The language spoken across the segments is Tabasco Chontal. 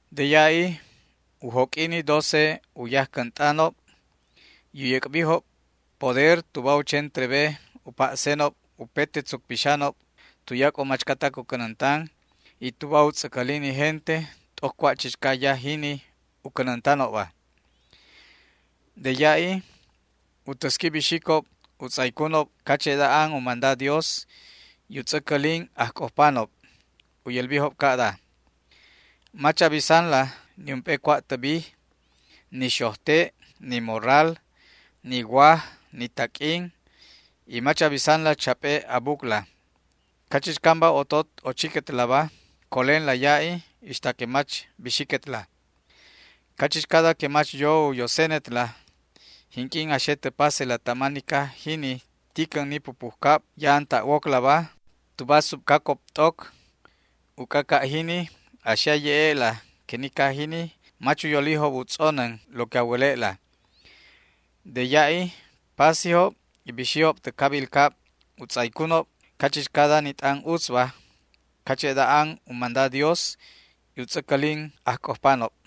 De ya'i u joq'ui ni doce u yajcänt'anob y u yäc'bijob poder tuba u chen trebe u pa'senob upete tzuc pixanob tuyac'o machcatac u cänäntan y tuba u tz'äcälin ni gente t'oc cua' chichca yaj jini u cänäntanobba. De ya'i u täsqui bixicob u tz'aycunob cache'da an u manda Dios, y u tz'äcälin ajc'ojpanob. U yälbijob ca'da: ―Mach a bisanla niump'e cua' tä bij, ni xojte', ni morral, ni waj, ni taq'uin, y mach a bisanla chap'e a bucla. Cachichcamba otot ochiquetlaba colenla ya'i ixta que mach bixiquetla. Cachichcada que mach yo u yosenetla, jinq'uin a xe tä pasela tama ni caj jini ticän ni pupujcab ya'an ta' woclaba tuba subcacob t'oc, uc'a ca' jini a xe a ye'e'la que ni caj jini mach u yolijob u tz'onän lo que a wäle'la. De ya'i pasijob y bixijob tä cabil cab u tz'aycunob cachichcada ni t'an utzba cache'da an u manda Dios, y u tz'äcälin ajc'ojpanob.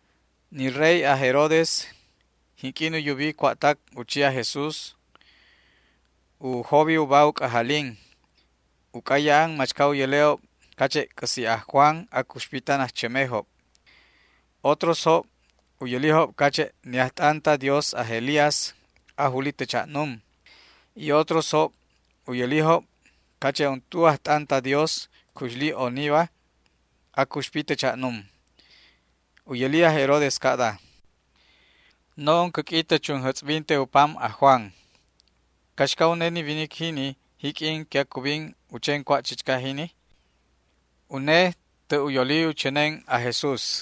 Ni rey aj Herodes jinq'uin u yubi cua'tac u chi aj Jesús, u jobi uba u c'ajalin, uc'a ya'an machca u yäle'ob cache' c'äsi' aj Juan acuxpi tan ajchämejob. Otrosjob u yälijob cache' ni ajt'an ta Dios aj Elías ajuli tä cha'num y otrosjob u yälijob cache' untu ajt'an ta Dios cuxli oniba acuxpi tä cha'num. U yäli aj Herodes ca'da: ―No'on cäq'ui tä chunjätz'binte u pam aj Juan. ¿Caxca une ni winic jini jiq'uin que acubin u chen cua' chichca jini? Une tä' u yoli u chänen aj Jesús.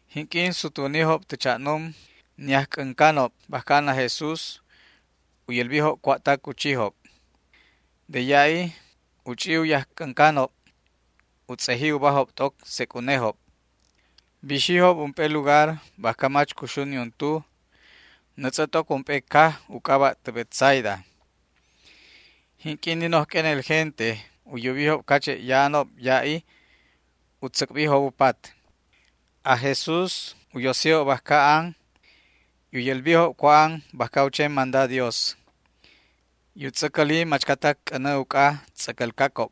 Jinq'uin sutwänijob tä cha'num ni ajc'äncanob bajca an aj Jesús u yälbijob cua'tac u chijob. De ya'i u ch'i u yajc'äncanob u tz'eji ubajob t'oc sec' unejob. Bixijob ump'e lugar bajca mach cuxu niuntu nätz'ä t'oc ump'e caj u c'aba' tä Betsaida. Jinq'uin ni noj q'uenel gente u yubijob cache' ya'anob ya'i u tzäc'bijob u pat. Aj Jesús u yosijob bajca an y u yälbijob cua' an bajca u chen manda Dios, y u tz'äcäli machcatac c'änä uc'a tz'äcälcacob.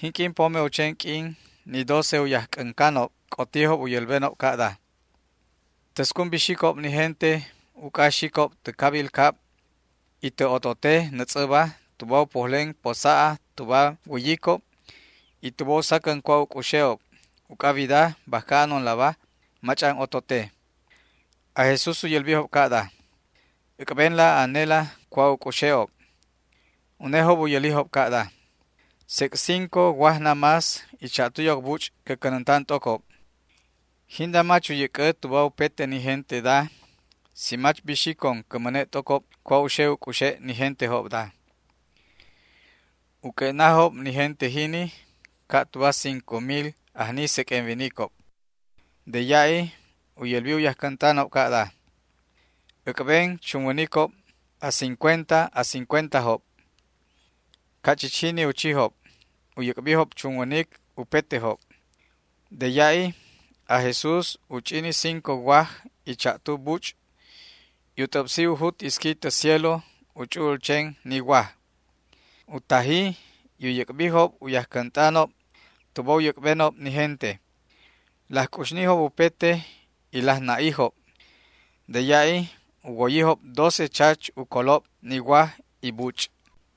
Jinq'uin pome u chen q'uin ni doce u yajc'äncanob c'otijob u yälbenob ca'da: ―Täscun bixicob ni gente uc'a xicob tä cabil cab y tä otote nätz'äba tuba u pojlen posa'a tuba wäyicob y tuba u sacän cua' u c'uxe'ob, uc'a wida bajca anonlaba mach'an otote. Aj Jesús u yälbijob ca'da: ―Äc'benla anela cua' u c'uxe'ob. Unejob u yälijob ca'da: ―Sec' cinco waj namás y cha'tu yoc buch' cä cänäntan t'ocob. Jinda mach u yäc'ä tuba upete ni genteda si mach bixicon cä mäne' t'ocob cua' u xe u c'uxe' ni gentejobda. U q'ue'najob ni gente jini, ca' tuba cinco mil ajni seq'uen winicob. De ya'i u yälbi u yajcänt'anob ca'da: ―Äc'ben chunwänicob a cincuenta a cincuentajob. Ca' chich jini u chijob, u yäc'bijob chunwänic upetejob. De ya'i aj Jesús u ch'i ni cinco waj y cha'tu buch' y u t'äbsi u jut isqui tä cielo u ch'u'ul chen ni waj. U taji y u yäc'bijob u yajcänt'anob tuba u yäc'benob ni gente. Laj c'uxnijob upete y laj na'ijob. De ya'i u woyijob doce chach u colob ni waj y buch'.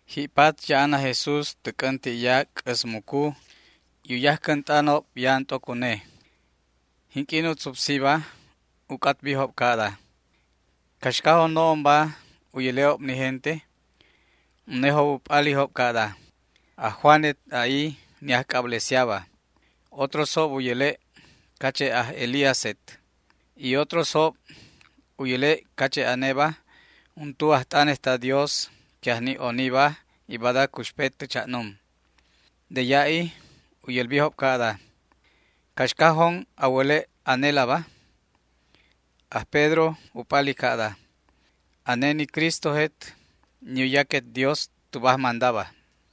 Ji'pat ya'an aj Jesús tä c'änti'ya c'äsmucu y u yajcänt'anob ya'an t'oc une. Jinq'uin u tzupsiba, u c'atbijob ca'da: ―¿Caxcajon no'onba u yäle'ob ni gente? Unejob u p'alijob ca'da: ―Aj Juanet, a'i, ni ajc'ablesiaba. Otrosjob u yäle' cache' aj Elíaset, y otrosjob u yäle' cache' aneba untu ajt'anet ta Dios que ajni oniba y bada acuxpet tä cha'num. De ya'i u yälbijob ca'da: ―¿Caxcajon a wäle' anelaba? Aj Pedro u p'ali ca'da: ―Ane ni Cristojet, ni u yaquet Dios tuba ajmandaba.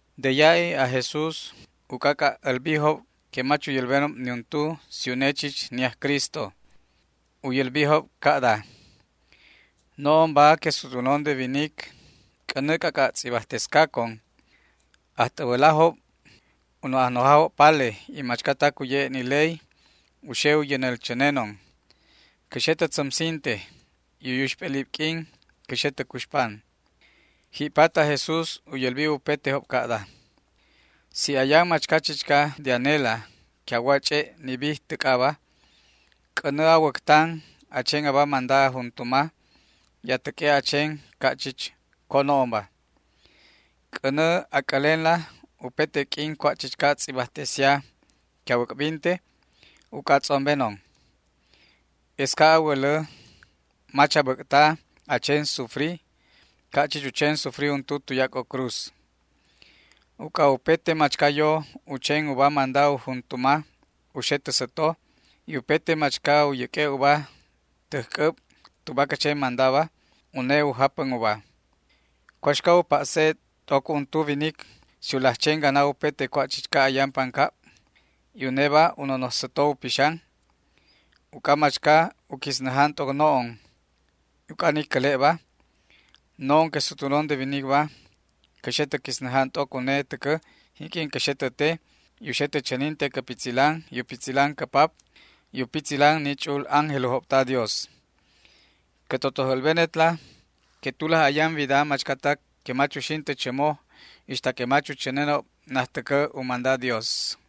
De ya'i aj Jesús u c'ac'a' älbijob que mach u yälbenob niuntu si une chich ni aj Cristo. U yälbijob ca'da: ―No'onba que sutwänon de winic c'änä c'ac'a' tz'ibajtescacon. Ajt'äbälajob, u no' ajnojajob pale y machcatac u ye'e' ni ley u xe u yänäl chänenon. Cä xe tä tzämsinte y u yuxp'elib q'uin cä xe tä cuxpan. Ji'pat aj Jesús u yälbi upetejob ca'da: ―Si ayan machca chichca de anela que a wo a ch'e' ni bij täc'aba, c'änä a wäctan a chen aba manda a juntuma y a täq'ue' a chen ca' chich co no'onba. C'änä a c'älenla upete q'uin cua' chichca tz'ibajtesia que a wäc'binte uc'a a tz'ombenon. Es ca' a wälä mach a bäc'ta a chen sufri ca' chich u chen sufri untu tuyac'o cruz. Uc'a upete machca yo u chen uba manda u juntuma u xe tä säto, y upete machca u yäq'ue' uba täj c'äb tuba cä chen mandaba, une u japän uba. ¿Cuaxca u pa'se t'oc untu winic si u laj chen gana upete cua' chichca ayan pancab, y uneba u nonoj säto u pixan? Uc'a machca u quisnäjan t'oc no'on y uc'a ni cäle'ba, no'on que sutwänon de winicba cä xe tä quisnäjan t'oc une täcä jinq'uin cä xe tä te y u xe tä chäninte cä pitzilan, y u pitzilan cä Pap y u pitzilan ni ch'u'ul ángelojob ta Dios. Cä totoj älbenetla que tulaj ayan widaba machcatac que mach uxin tä chämo ixta que mach u chänenob najtäcä u manda Dios.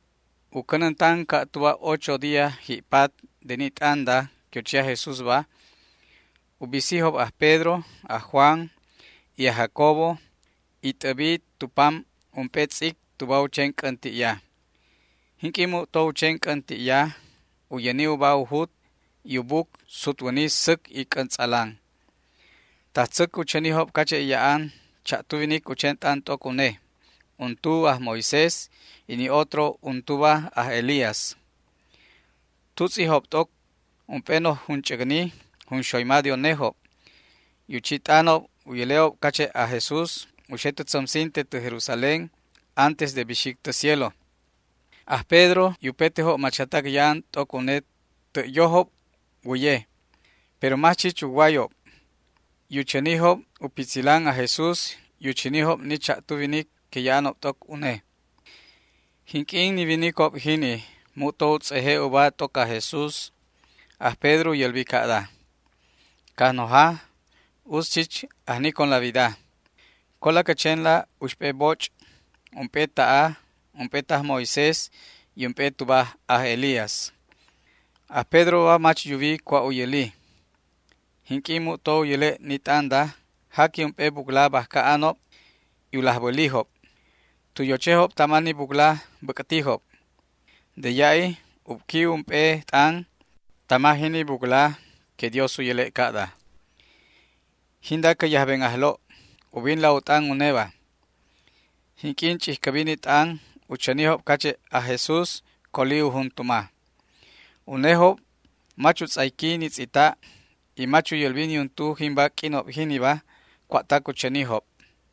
U cänäntan ca' tuba ocho día ji'pat de ni t'anda que u chi aj Jesúsba, u bisijob aj Pedro, aj Juan y aj Jacobo y t'äbi tu pam ump'e tz'ic tuba u chen c'änti'ya. Jinq'uin mu'to u chen c'änti'ya u yäni uba u jut y u buc sutwäni säc y c'äntz'alan. Tajtzäc u chänijob cache' ya'an cha'tu winic u chen t'an t'oc une, untu aj Moisés y ni otro untuba aj Elías. Tutz'ijob t'oc ump'e noj junch'äcni junxoyma de unejob, y u chi t'anob u yäle'ob cache' aj Jesús u xe tä tzämsinte tä Jerusalén antes de bixic tä cielo. Aj Pedro y upetejob machcatac ya'an t'oc une tä' yojob wäye, pero mach chich uwayob, y u chänijob u pitzilan aj Jesús y u chänijob ni cha'tu winic que ya'anob t'oc une. Jinq'uin ni winicob jini mu'to u tz'eje' ubajob t'oc aj Jesús, aj Pedro u yälbi ca'da: ―Cajnoja, utz chich ajniconla wida. Cola cä chenla uxp'e boch': ump'e ta'a, ump'e taj Moisés y ump'e tuba aj Elías. Aj Pedroba mach yuwi cua' u yäli. Jinq'uin mu'to u yäle' ni t'anda jaqui ump'e bucla bajca anob y u laj bälijob. Tu yochejob tama ni bucla bäc'tijob. De ya'i ubqui ump'e t'an tama jini bucla que Dios u yäle' ca'da: ―Jinda cä yajben Ajlo'. Ubinla u t'an uneba. Jinq'uin ch'ijcäbi ni t'an u chänijob cache' aj Jesús coli u juntuma. Unejob mach u tz'ayqui ni tz'ita' y mach u yälbi niuntu jimba q'uinob jiniba cua'tac u chänijob.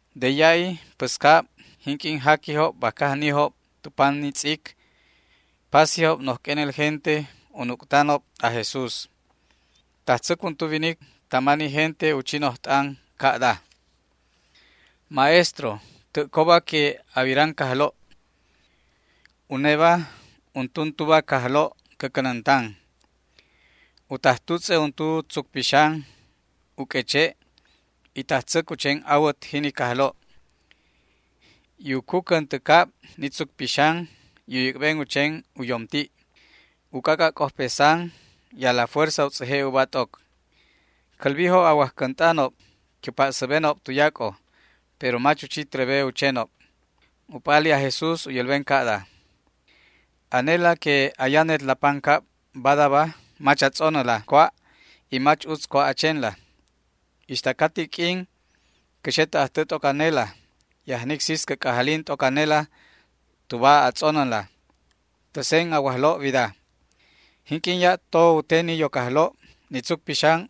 De ya'i päscab, jinq'uin jaquijob bajca ajnijob tu pam ni tz'ic, pasijob noj q'uenel gente u nuc'tanob aj Jesús. Tajtzäc untu winic tama ni gente u chi noj t'an ca'da: ―Maestro, tä' coba que a wiran cajlo'. Uneba untuntuba cajlo' cä cänäntan. U taj tutz'e untu tzuc pixan u q'ueche' y tajtzäc u chen awät jini cajlo', y u cucän tä cab ni tzuc pixan u yäc'ben u chen u yomti'. U c'ac'a' c'ojpesan y a la fuerza u tz'eje' uba t'oc. Cälbijob a wajcänt'anob que u pa'säbenob tuyac'o, pero mach u chi trebe u chenob. U p'ali aj Jesús u yälben ca'da: ―¡Anela que ayanetla pancab badaba mach a tz'onäla cua' y mach utz cua' a chenla! ¿Ixta ca ti q'uin cä xe tä ajtä t'oc anela y ajnic sis cä c'ajalin t'oc anela tuba a tz'onänla? Täsen a wajlo' wida. Jinq'uin ya'to u te ni yoc ajlo' ni tzuc pixan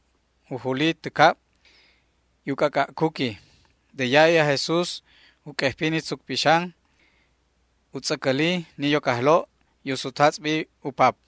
u juli tä cab y u c'ac'a' cuqui. De ya'i aj Jesús u q'uejpi ni tzuc pixan, u tz'äcäli ni yoc ajlo' y u sutjatz'bi u pap.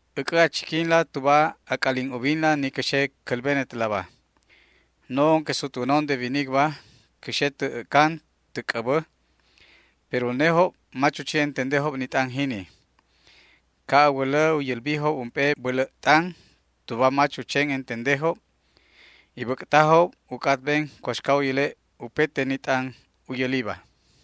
―Äc'ä a chiquinla tuba a c'alin ubinla ni cä xe cälbenetlaba: No'on que sutwänon de winicba cä xe tä ä'can tä c'äbä. Pero unejob mach u chi entendejob ni t'an jini. Ca' a wälä u yälbijob ump'e bälä' t'an tuba mach u chen entendejob, y bäc'tajob u c'atben cuaxca u yäle' upete ni t'an u yäliba.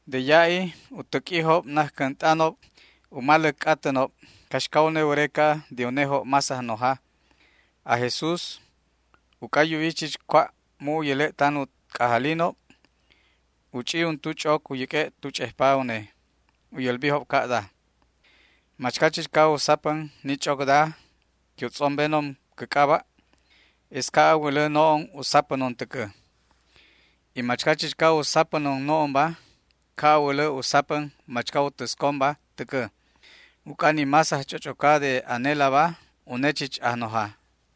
De ya'i u täq'uijob najcänt'anob u maläc c'atänob caxca une wäreca de unejob más ajnoja. Aj Jesús, uc'a yuwi chich cua' mu' u yäle' tan u c'ajalinob, u ch'i untu ch'oc u yäq'ue' tu ch'ejpa une. U yälbijob ca'da: ―Machca chichca u sapän ni ch'ocda que u tz'ombenon cä c'aba', es ca' a wälä no'on u sapänon täcä, y machca chichca u sapänon no'onba, ca' a wälä u sapän machca u täsconba täcä, uc'a ni más ajch'och'oca de anelaba, une chich ajnoja.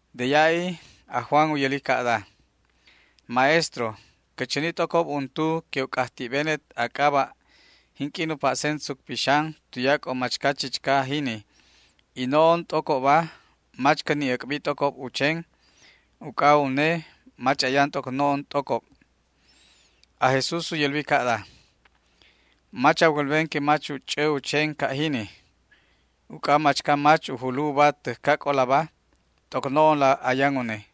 De ya'i aj Juan u yäli ca'da: ―Maestro, cä chäni t'ocob untu que u c'ajti'benet a c'aba' jinq'uin u pa'sen tzuc pixan tuyac'o machca chichca jini, y no'on t'ocobba mach cä ni' äc'bi t'ocob u chen, uc'a une mach ayan t'oc no'on t'ocob. Aj Jesús u yälbi ca'da: ―Mach a wälben que mach u ch'ä u chen ca' jini, uc'a machca mach u julu uba täjcac'olaba, t'oc no'onla ayan une.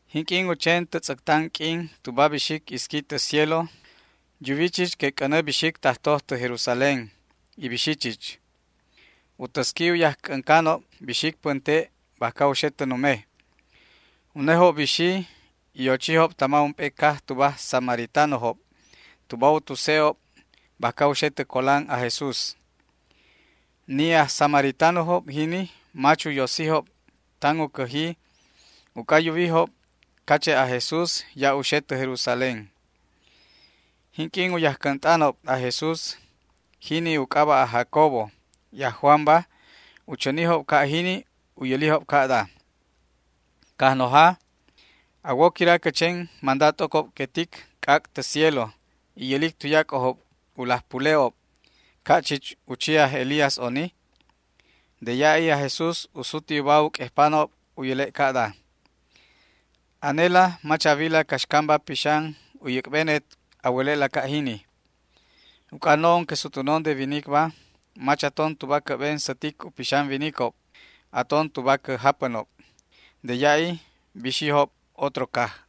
Jinq'uin u chen tä tz'äctan q'uin tuba bixic isqui tä cielo, yuwi chich que c'änä bixic tajtoj tä Jerusalén, y bixi chich. U täsqui u yajc'äncanob bixic pänte' bajca u xe tä nume. Unejob bixijob y ochijob tama ump'e caj tuba aj samaritanojob tuba u tuse'ob bajca u xe tä colan aj Jesús. Ni aj samaritanojob jini mach u yosijob tan u cäji uc'a yuwijob cache' aj Jesús ya' u xe tä Jerusalén. Jinq'uin u yajcänt'anob aj Jesús, jini u c'aba' aj Jacobo y aj Juanba, u chänijob ca' jini u yälijob ca'da: ―Cajnoja, ¿a wo quira cä chen manda t'ocob que tic c'ac' tä cielo y yälic tuyac'ojob u laj pule'ob, ca' chich u chi aj Elías oni? De ya'i aj Jesús u suti uba u q'uejpanob u yäle' ca'da: ―Anela mach a wila caxcamba pixan u yäc'benet a wäle'la ca' jini. Uc'a no'on que sutwänon de winicba mach aton tuba cä'ben sätic u pixan winicob, aton tuba cä japänob. De ya'i bixijob otro caj.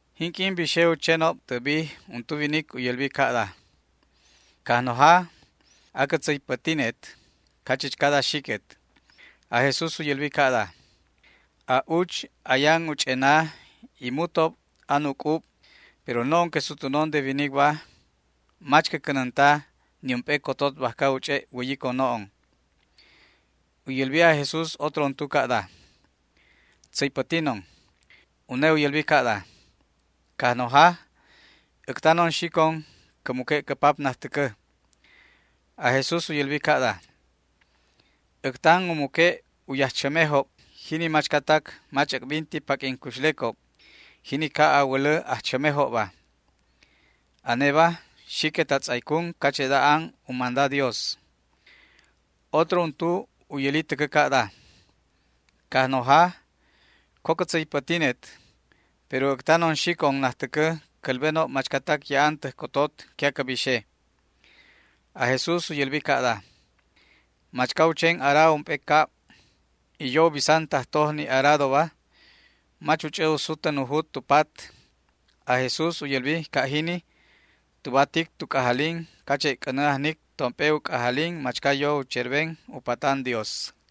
Jinq'uin bixe u chenob tä bij untu winic u yälbi ca'da: ―Cajnoja, acä tzäypätinet cachichcada xiquet. Aj Jesús u yälbi ca'da: ―A'uch ayan u ch'ena y mutob an u c'ub, pero no'on que sutwänon de winicba mach cä cänänta niump'e cotot bajca u ch'e' wäyicon no'on. U yälbi aj Jesús otro untu ca'da: ―Tzäypätinon. Une u yälbi ca'da: ―Cajnoja, äctanon xicon cä muque' cä pap najtäcä. Aj Jesús u yälbi ca'da: ―Äctan u muque' u yajchämejob jini machcatac mach äc'binti paq'uin cuxlecob, jini ca' a wälä ajchämejobba. Aneba, xiquet a tz'aycun cache'da an u manda Dios. Otro untu u yäli täcä ca'da: ―Cajnoja, co cä tzäypätinet, pero äctanon xicon najtäcä cälbenob machcatac ya'an täj cotot que acä bixe. Aj Jesús u yälbi ca'da: ―Machca u chen ara ump'e cab y yo u bisan tajtoj ni aradoba, mach u ch'ä u sutän u jut tu pat ―aj Jesús u yälbi ca' jini tuba tic tu c'ajalin cache' c'änä ajnic tomp'e u c'ajalin machca yo u cherben u patan Dios.